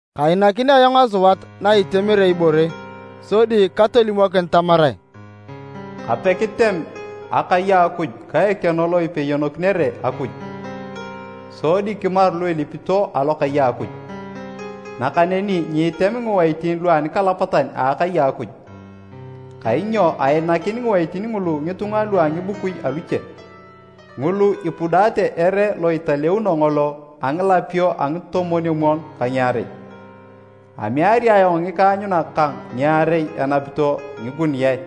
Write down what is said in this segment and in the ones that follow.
Kainakin ayong asuat na itemere ibore, sodi katolimokin tamarae, “Kape kitem akai a Akuj ka ekeno lo ipeyonokinere Akuj, sodi kimaru lu ilipito alokai a Akuj. Nakaneni nyiitem ngiwaitin lu anikalapatan a akai a Akuj, kainyo ainakin ngiwaitin ngulu ngitunga lua ngibukui aluche, ngulu ipudaate ere lo italeuno ngolo a ngilapio a ngitomwon-omwon ka ngiarei. Ameari ayong ngikaanyunak kang ngiarei enapito ngikuniae,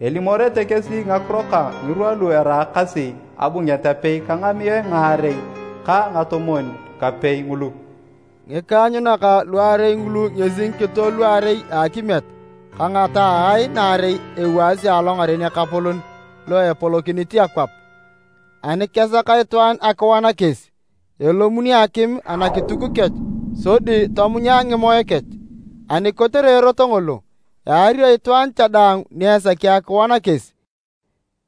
elimorete kesi ngakiro kang ngirwa lu eraakasi abunget apei ka ngamiae ngaarei ka ngatomwon-kapei ngulu.” Ngikaanyunak luarei ngulu ngesi ngikito luarei a akimiet ka ngataae naarei ewaasi alongaren Ekapolon lo epolokinit akwap. Ani kesak itwaan akiwan kesi, elomuni akim anakituk kech sodi tomunya ngimoe kech. Ani kotere erot ngolo, eario itwaan cha daang ni esaki akiwan kesi.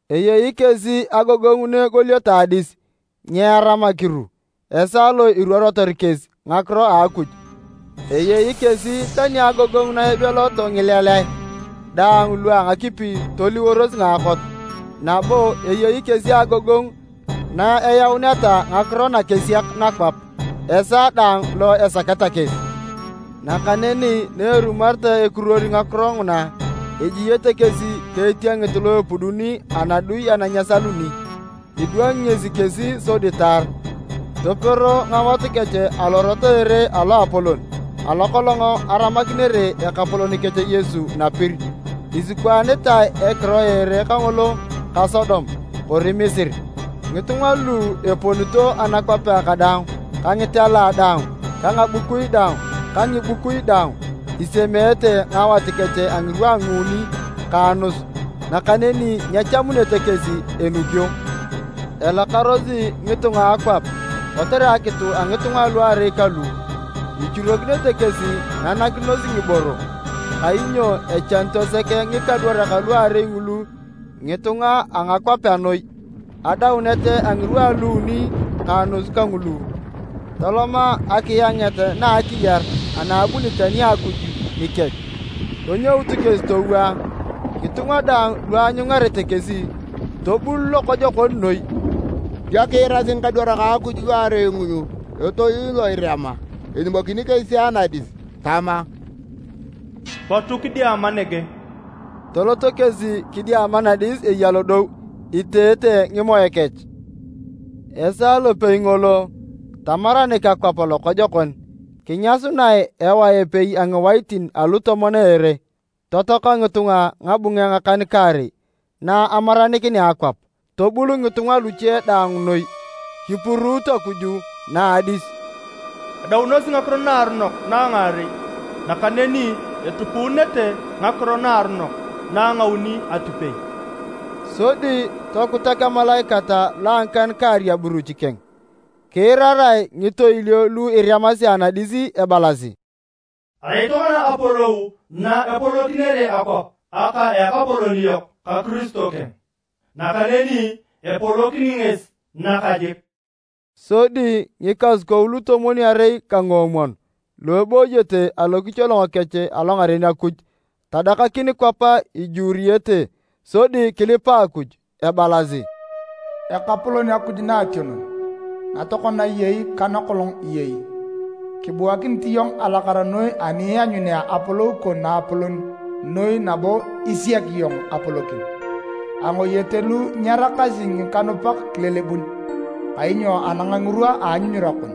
Eyei kesi agogongu na egolioto adis, nyeeram akiru esaa lo iruorotor kesi ngakiro a Akuj. Eyei kesi tani agogongu na ibeloto ngileleae daang lu a ngakipi toliworos ngaakot, nabo eyei kesi agogongu na eyauneta ngakiro nakesiak nakwap, esaa daang lo esaketa kesi. Nakaneni na erumoreta ekiruor ngakiro nguna, ejiete kesi ka etiengit lo epuduni anadui ana nyesaluni. Idwangi ngesi kesi sodi taar, topero ngawat kech alorot a ere aloapolon, alo kolong aramakinere Ekapolon kech Yesu napir. Isikwaanitae ekiro a ere kangolo ka Sodom, kori Misiri. Ngitunga lu eponito anakwapea kadaang ka ngitela daang ka ngabukui daang ka ngibukui daang, isemeete ngawat kech a ngirwa a nguuni ka anus, nakaneni nyechamunete kesi enukio. Elakarosi ngitunga a akwap kotere akitu a ngitunga aluarei kalu. Ichurokinete kesi nanakinos ngiboro, kainyo echanito sek ngikadwarak luarei ngulu ngitunga a ngakwapea noi. Adaunet a ngirwa a luuni ka anus kangulu, toloma akianget na a akiyar ana abunit ani a Akuj nikech. Tonyout kesi towaa. Ngitunga daang lu aanyungarete kesi, tobul lokojokon noi. Dio kiirasi ngikadwarak a Akuj luarei ngulu etoil lo erema elimokini kesi anadis tama, “Potu kidiama nege!” Toloto kesi kidiama nadis eya lodou, iteete ngimoe kech. Esaa lopei ngolo, tamaranik akwap lokojokon, kinyasunae ewae epei a ngiwaitin alutomon a ere. Totoaka ngitunga ngabunge ngakan-kaarei na amaranikinea akwap. Tobul ngitunga luche daang noi, kipuruut Akuj na a adis. Adaunosi ngakiro naaronok na a ngaarei, nakaneni etupuunete ngakiro naaronok na a ngauni atipei! Sodi tokutak emalaikat lo a ngikan-kaarei aburuch keng, kiirarae ngitoilio lu eremasi anadis ebalasi, “Erai tokona apolou na epolokinere akwap aka Ekapolon yok ka Kiristo keng, nakaneni epolokini ngesi nakajik!” Sodi ngikasukou lutomwon-arei ka nguomwon lu ebooyete alokicholongo kech alongaren Akuj tadakakin kwap ijuuruyete sodi kilipa Akuj, ebalasi: “Ekapolon Akuj Naationon, na tokona iyei ka nakolong iyei! Kibuakinit iyong alakara noi ani ianyunea apolou kon naapolon noi nabo isiak iyong apolokin! Angoyete lu nyeraakasi ngikanupak kilelebun, kainyo anang ngirwa a anyunyura kon,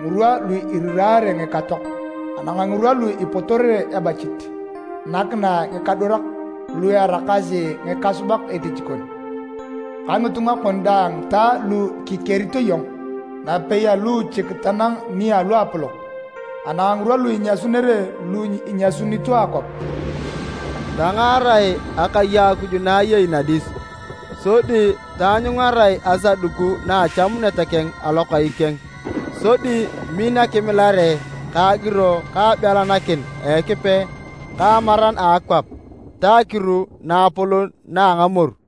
ngirwa lu iriraare ngikatoak. Anang ngirwa lu ipotorere ebachit, nakinae ngikadwarak, lu eraakasi ngikasubak etich kon, ka ngitunga kon daang ta lu kikerito iyong, napei aluuchik tanang ni luapolok. Anang ngirwa lu inyasunere lu inyasunito akwap!” Tangaarae akai a Akuj na eyei nadis, sodi taanyungarae asaduku na a Achamunet keng alokai keng. Sodi min akimileare ka agiro ka abelanakin a Ekipe ka amaran a akwap ta akiru naapolon na a ngamoru.